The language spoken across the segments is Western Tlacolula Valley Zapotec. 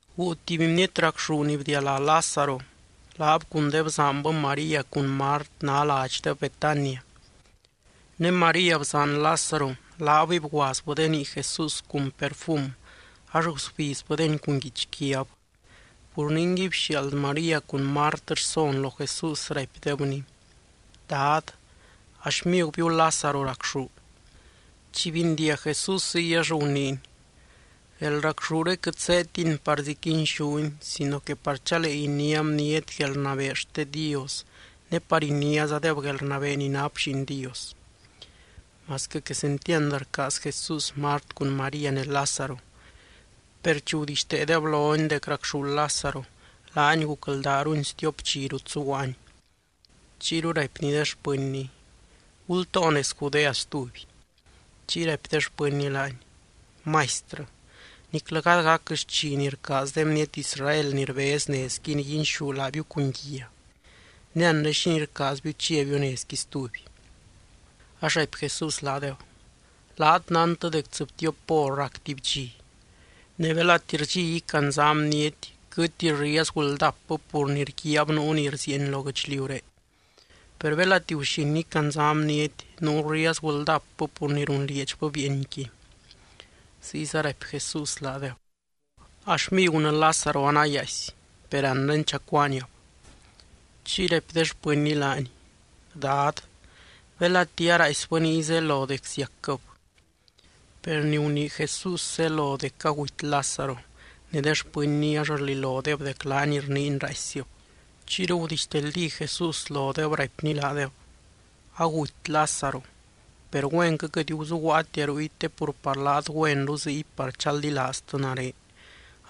Guu tuby bniety racxú ni bdialá Lázaro. Laab cun de bzaanbɨ María cun Mart ná ladxdeb Betania. (Ne María, bzaan Lázaro, laabɨy bguaazbɨ de nii Jesús cun perfum ax gusbizbɨdeni cun guichquiab.) Pur ningui bxiaald María cun Mart rson lo Jesús, raipdebny: —Dad, a xmigubiu Lázaro racxú. Chi bindiag Jesús ziy ax guniiny: —Guelracxúre quɨt zéedtini parzi quinxúni sino que par chalee iniá bniety guelrnabee xte Dios ne par iniázadeb guelrnabee ni nap Lliin Dios. Masquɨ quesentiand rcaaz Jesús Mart cun María ne Lázaro, per chi gudixteedeb lony dec racxú Lázaro, laany gucldaarulny stiop dxi rut zuguaany. Chiyru raipny de xpɨnny: —Gultoo nez Judea stuby. Chiy raipy de xpɨnny laany: —Maistrɨ, niclɨ gady gac xchi ni rcaaz de bniety Israel ni rbez nezqui niguinxú laabiu cun guia. Ne anre, ¿xínii rcaazbiu chiabiu nezqui stuby? Ax raipy Jesús laadeb: —Laat nántɨ dec tsɨbtiop hor rac tuby dxi. Ne belati rdxi icandzá bniety quɨtti riezgu ldapbɨ pur ni rguiaab nuu ni rzieeny lo guɨchliuré. Per belati guxin icandzá bniety nuu riezgu ldapbɨ pur ni runlieedxbɨ bieenqui. Ziyza raipy Jesús laadeb: —A xmigunɨ Lázaro anayaaisy. Per anre chacuaaniab. Chiy raipy de xpɨnny laany: —Dad, belati araaisbɨ niy zelo dec ziacquɨb. Per ni gunii Jesús zelo dec aguty Lázaro, ne de xpɨnny ax rlilodeb dec laany rniiny raaissib. Chiyru gudixteldí Jesús lodeb raipny laadeb: —Aguty Lázaro. Per güenquɨ quɨt guzuguaatia ruy te pur par laat güenru ziy par chaldilaaztɨ nare.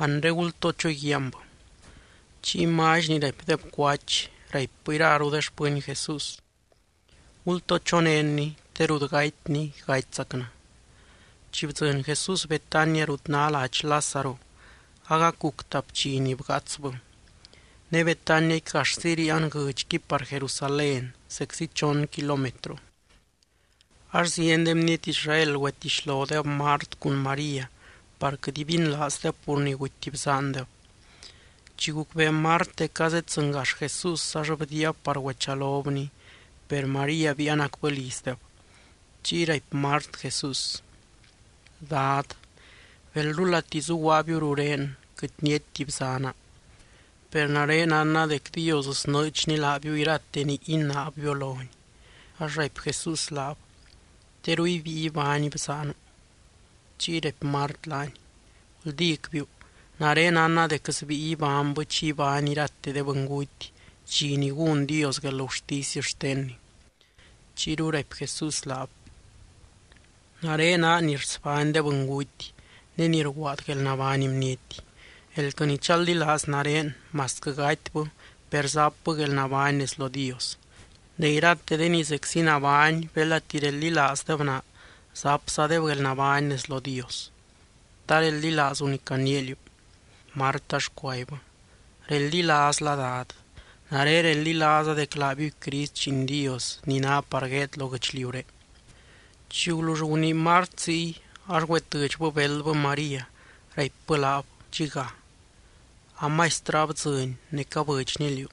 Anre gultoo choguiaanbɨ. Chiy Mally ni raipdeb “Cuach”, raipbɨ iraru de xpɨny Jesús: —Gultoo chonénny, te rut gatyny gatyzacnɨ. Chi bdzɨny Jesús Betania rut ná ladx Lázaro, agac guc tap dxi ni bgaatsbɨ. Ne Betaniaqui gaxzi ríian guɨdxqui par Jerusalén, zeczi chon kilómetro. Ax zieny de bniety Israel güetixlodeb Mart cun María par quɨt ibinlaazdeb pur ni guty bzaandeb. Chi gucbee Mart dec azeddzɨngax Jesús ax bdiiab par güechalobny. Per María biianacbɨ lizdeb. Chiy raipy Mart Jesús: —Dad, belrulati zuguaabiu rurén, quɨt niaitti bzaana. Per nare nánna dec Dios snɨɨdxny laabiu irate ni inaabbiu lony. Ax raipy Jesús laab: —Teru ibíi ibány bzaanu. Chiy raipy Mart laany: —Guldícbiu, nare nánna dec sbíi ibánybɨ chi ibány irate de bɨnguty, dxi ni gún Dios guelgurtisy xtenny. Chiyru raipy Jesús laab: —Nare naa ni rsbány de bɨnguty, ne ni rguaad guelnabány bniety. Elquɨ ni chaldilaaz nare, masquɨ gatybɨ, per zapbɨ guelnabány nez lo Dios. Ne irate de ni zeczi nabány belati reldilaazdeb naa, zapzadeb guelnabány nez lo Dios. ¿Ta reldilaazu ni caniia liú? Mart ax cuaibbɨ: —Reldilaazla, Dad. Nare reldilaaza dec laabiuy Crist, Lliin Dios, ni ná par gueed lo guɨchliuré. Chi gulull gunii Mart ziy, ax güetɨdxbɨ beldbɨ María, raipbɨ laab dxiga: —A Maistrɨ abdzɨny ne cabɨdxny liú.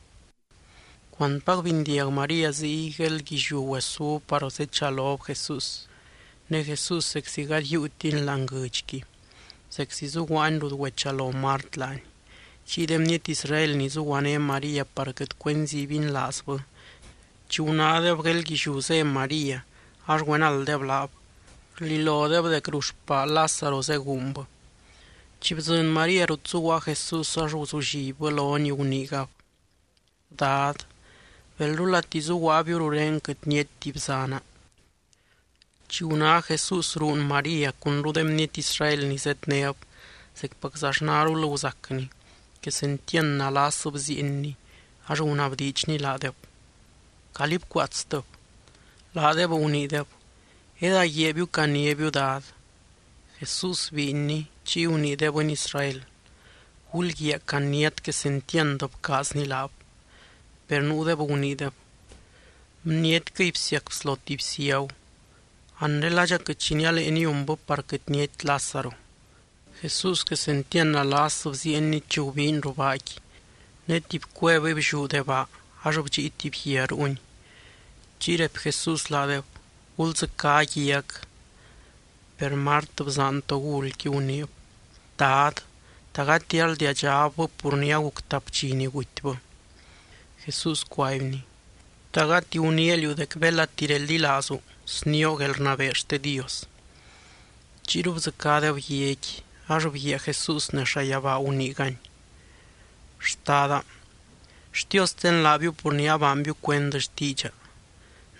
Cuantpac bindiag María ziy, gueeldguilliú güesúb par zechalob Jesús. Ne Jesús zeczi gady yiiutiny láani guɨdxqui. Zeczi zuguaany rut güechalo Mart laany. Chiy de bniety Israel ni zuguané María par quɨt cuenzi ibinlaazbɨ, chi gunádeb gueeldguilliú zé María ax güenalddeb laab. Rlilodeb dec ruu xpaa Lázaro zeguunbɨ. Chi bdzɨny María rut zuguaa Jesús, ax guzullibbɨ lony guniigab: —Dad, belrulati zuguaabiu rurén, quɨt niaitti bzaana. Chi guná Jesús ruun María cunru de bniety Israel ni zednéb, zecpaczaxnarul guzacny, quesentiand nalas bziienny ax gunabdiidxny laadeb: —Calí bcuaatstɨb. Laadeb guniideb: —Edaguiaabiu, caniábiu Dad. Jesús biinny. Chiy gunii de bɨny Israel: —Gulguiaa caniát quesentiand bcaazny laab. Per nuudeb guniideb: —Bnietquɨy bsiac bslo tuby ciagu. Anre, ¿ladxa quɨt xi nialee niunbɨ par quɨt niaitti Lázaro? Jesús quesentiand nalas bziienny chi gubiiny ruu baaqui. Ne tuby cuevɨy blliú de baa ax bdxii tuby guia ruuni. Chiy raipy Jesús laadeb: —Guldzɨcá guiac. Per Mart, bzaan togulqui, guniib: —Dad, ¿ta gati arldiadxabbɨ pur ni aguc tap dxi ni gutybɨ? Jesús cuaibny: —¿Ta gati guniia liú dec belati reldilaazu, snioo guelrnabee xte Dios? Chiyru bdzɨcádeb guiaqui. Ax bguiaa Jesús nez llayabaa guniigany: —Xtada, xtiosten laabiu pur ni abaanbiu cuend xtiidxa.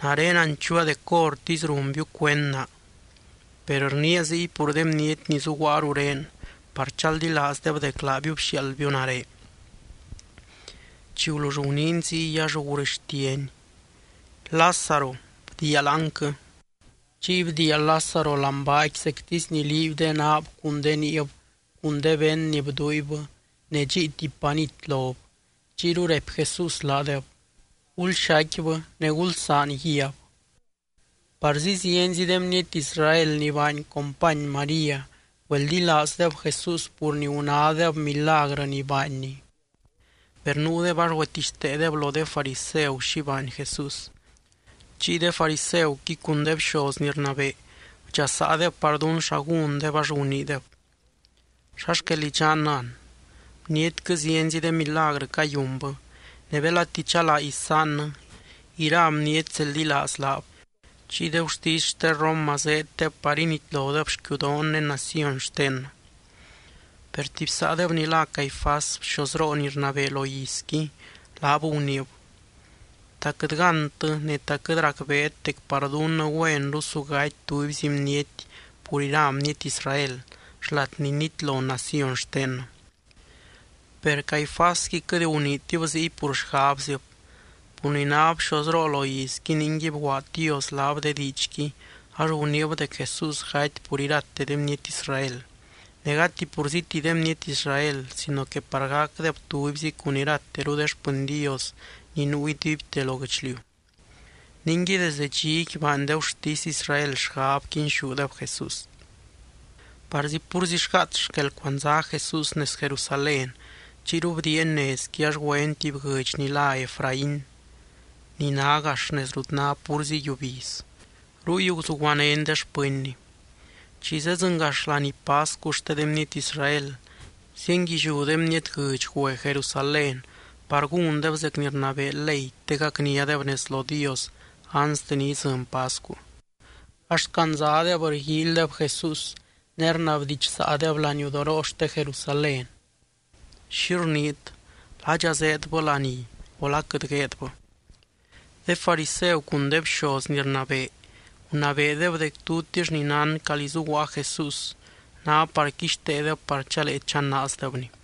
Nare nanchuua dec hórtisy runbiu cuend naa. Per rniia ziy pur de bniety ni zuguaa rurén par chaldilaazdeb dec laabiu bxiaaldbiu nare. Chi gulull guniiny ziy, ax gurɨxtiany: —¡Lázaro, bdiia láanquɨ! Chiy bdiia Lázaro láani baaqui zectisy ni liiby de naab cun de niib cun de vend ni bduuibbɨ ne dxíi tuby panit lob. Chiyru raipy Jesús laadeb: —Gulxaicquibɨ, ne gulsaan guiab. Parzi zienzi de bniety Israel ni baany company María, güeldilaazdeb Jesús pur ni gunádeb milagrɨ ni baanny. Per nuudeb ax güetixteedeb lo de fariseu xi baany Jesús. Chiy de fariseuqui cun de bxoz ni rnabee bdxasaadeb par dún xa gúndeb ax guniideb: —¿Xa xquel idxannɨ an? Bnietquɨ zienzi de milagrɨ cayunbɨ. Ne belati chalaa isaannɨ, ira bniety zeldilaaz laab. Chiy de gurtisy xte Roma zeeddeb par initlodeb xquiudoon ne naciony xtennɨ. Per tuby saadeb ni lá Caifás bxozroo ni rnabee lo izqui laab guniib: —¿Ta quɨt gántɨ ne ta quɨt racbeet dec par dunnɨ güenru su gaty tubyzi bniety pur ira bniety Israel, xlat ni nitlo naciony xtennɨ? Per Caifásqui quɨt guniitib ziy pur xgabzib. Pur ni náb bxozroo lo izqui, ningui bguaad Dios laab de diidxqui ax guniib dec Jesús gaty pur irate de bniety Israel. Ne gati purzíti de bniety Israel sino que par gacdeb tubyzi cun irateru de xpɨny Dios ni nuu iduibte lo guɨchliu. Ningui desde dxiqui baany de gurtisy Israel xgab quinxúdeb Jesús. Parzi púrzi xgaats xquel cuandzá Jesús nez Jerusalén. Chiyru bdiiany nezqui ax güeny tuby guɨdx ni lá Efraín ni ná gax nez rut ná púrzi yiubiz. Ruy guzuguanény de xpɨnny. Chi zeddzɨngax laní pascu xte de bniety Israel, zienguilliú de bniety guɨdx güe Jerusalén par gúndeb zec ni rnabee ley te gacniadeb nez lo Dios anste ni idzɨny pascu. Ax candzadeb rguíilydeb Jesús, ne rnabdidxsaadeb laniudoroo xte Jerusalén: —¿Xi rniit? ¿Ladxa zeedbɨ laní o la quɨt gueedbɨ? De fariseu cun de bxoz ni rnabee gunabeedeb dec tutix ni nán calí zuguaa Jesús, ná par quixteedeb par chalee chanaazdebny.